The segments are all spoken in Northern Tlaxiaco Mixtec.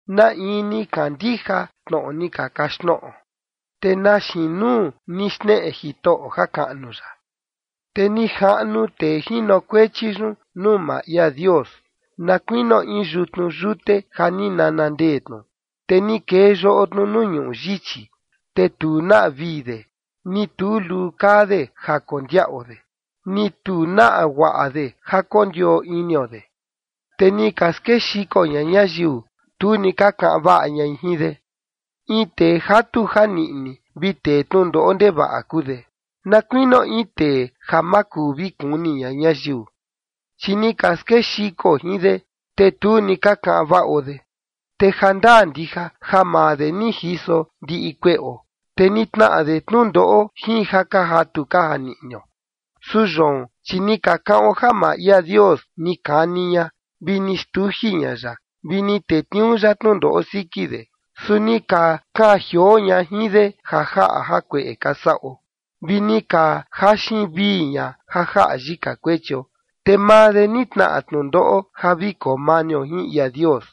¿Na in ni kandija tnoꞌo ni ka kaxtnoꞌo? ¿Te na xiin nuu ni xneꞌe Jitoꞌo jakaꞌnu ya? Te ni jaꞌnu tee jinokuechi yun nuu maa ia Dios, na kuinio in yutnu yute ja ni nana ndee tnu, te ni kee yoꞌo tnu nuu ñuꞌu yichi. Te tu naꞌa vii de, ni tu luu kaa de ja kondiaꞌo de, ni tu naꞌa guaꞌa de ja kondioo inio de. Te ni ka skexiko ña ñayiu, tu ni ka kaꞌan vaꞌa ñai jin de. In tee jatu janiꞌni vi tee tnundoꞌo ndevaꞌa kuu de, na kuinio in tee ja ma kuu vi kuni ña ñayiu. Chi ni ka skexiko jin de, te tu ni ka kaꞌan vaꞌo de. Te jandaa ndija ja maa de ni jiso ndiꞌi kueꞌo, te ni tnaꞌa de tnundoꞌo jin ja ka jatu ka janiꞌnio. Su yoon, chi ni ka kaꞌon ja maa ia Dios ni kani ña, vi ni xtuji ña ya, vi ni tetniuu ya tnundoꞌo siki de. Su ni ka kaan jioo ña jin de ja jaꞌa jakueꞌe ka saꞌo, vi ni ka jaxin vii ña ja jaꞌa yika kuechio. Te maa de ni tnaꞌa tnundoꞌo ja vi koo manio jin ia Dios,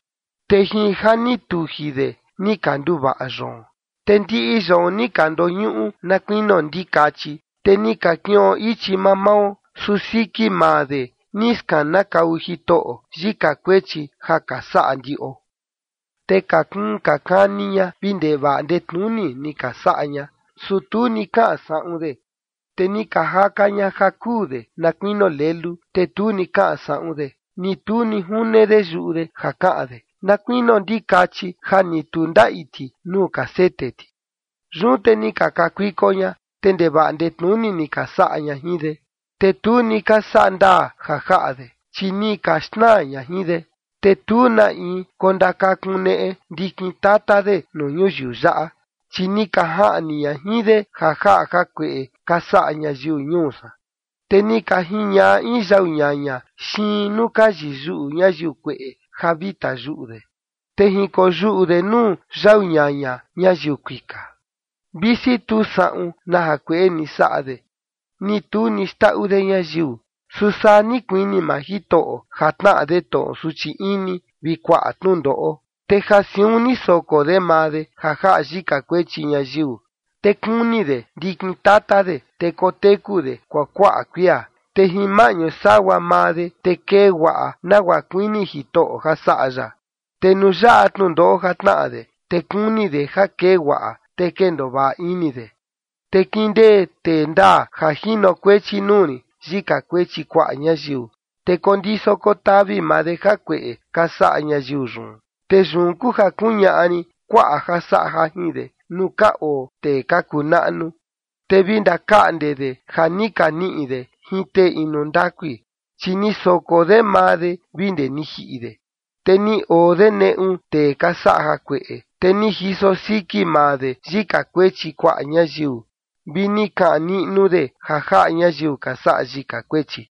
te jin ja ni tuji de ni ka nduvaꞌa yoon. Te ndiꞌi yoon ni ka ndoñuꞌu na kuinio ndikachi, te ni ka kiꞌon ichi mamao. Su siki maa de ni skanakau Jitoꞌo yika kuechi ja ka saꞌa ndiꞌo. Te ka kuun ka kani ña vi ndevaꞌa ndetnuni ni ka saꞌa ña, su tu ni kaꞌan saꞌun de; te ni ka jaka ña ja kuu de na kuinio lelu. Te tu ni kaꞌan saꞌun de, ni tu ni june de yuꞌu de ja kaꞌan de na kuinio ndikachi ja ni tu ndaꞌi ti nuu ka sete ti. Yun te ni ka kakuiko ña, te ndevaꞌa ndetnuni ni ka saꞌa ña jin de, te tu ni ka saꞌa ndaa ja jaꞌa de, chi ni ka xnaa ña jin de. Te tu na in kondakakuneꞌe ndikin tata de nuu ñuyiu yaꞌa, chi ni ka jaꞌni ña jin de ja jaꞌa jakueꞌe ka saꞌa ñayiu ñuu san. Te ni ka jiñaꞌa in yau ñaña xiin nuu ka yiyuꞌu ñayiu kueꞌe ja vi tayuꞌu de, te jinkoyuꞌu de nuu yau ñaña ñayiu kuika, visi tu saꞌun na jakueꞌe ni saꞌa de, ni tu ni xndaꞌu de ñayiu. Su saa ni kuini maa Jitoꞌo ja tnaꞌa de tnoꞌo suchi ini vi kuaꞌa tnundoꞌo, te ja siun ni soko de maa de ja jaꞌa yika kuechi ñayiu. Te kuni de ndikin tata de, te koteku de kuakuaꞌa kuia, te jin maꞌñu sagua maa de, te kee guaꞌa nagua kuini Jitoꞌo ja saꞌa ya. Te nuu yaꞌa tnundoꞌo ja tnaꞌa de, te kuni de ja kee guaꞌa, te kendoo vaꞌa ini de. Te kindee tee ndaa ja jinokuechi nuu rin yika kuechi kuaꞌa ñayiu, te kondiso kotavi maa de jakueꞌe ka saꞌa ñayiu yun. Te yun kuu ja kuñaꞌa rin kuaꞌa ja saꞌa jajin de nuu ka oo tee ka kuu naꞌnu, te vi ndakaꞌnde de ja ni ka niꞌi de jin tee inu ndakui, chi ni soko de maa de vi ndee ni jiꞌi de, te ni oo de neꞌu tee ka saꞌa jakueꞌe, te ni jiso siki maa de yika kuechi kuaꞌa ñayiu, vi ni kaꞌan niꞌnu de ja jaꞌa ñayiu ka saꞌa yika kuechi.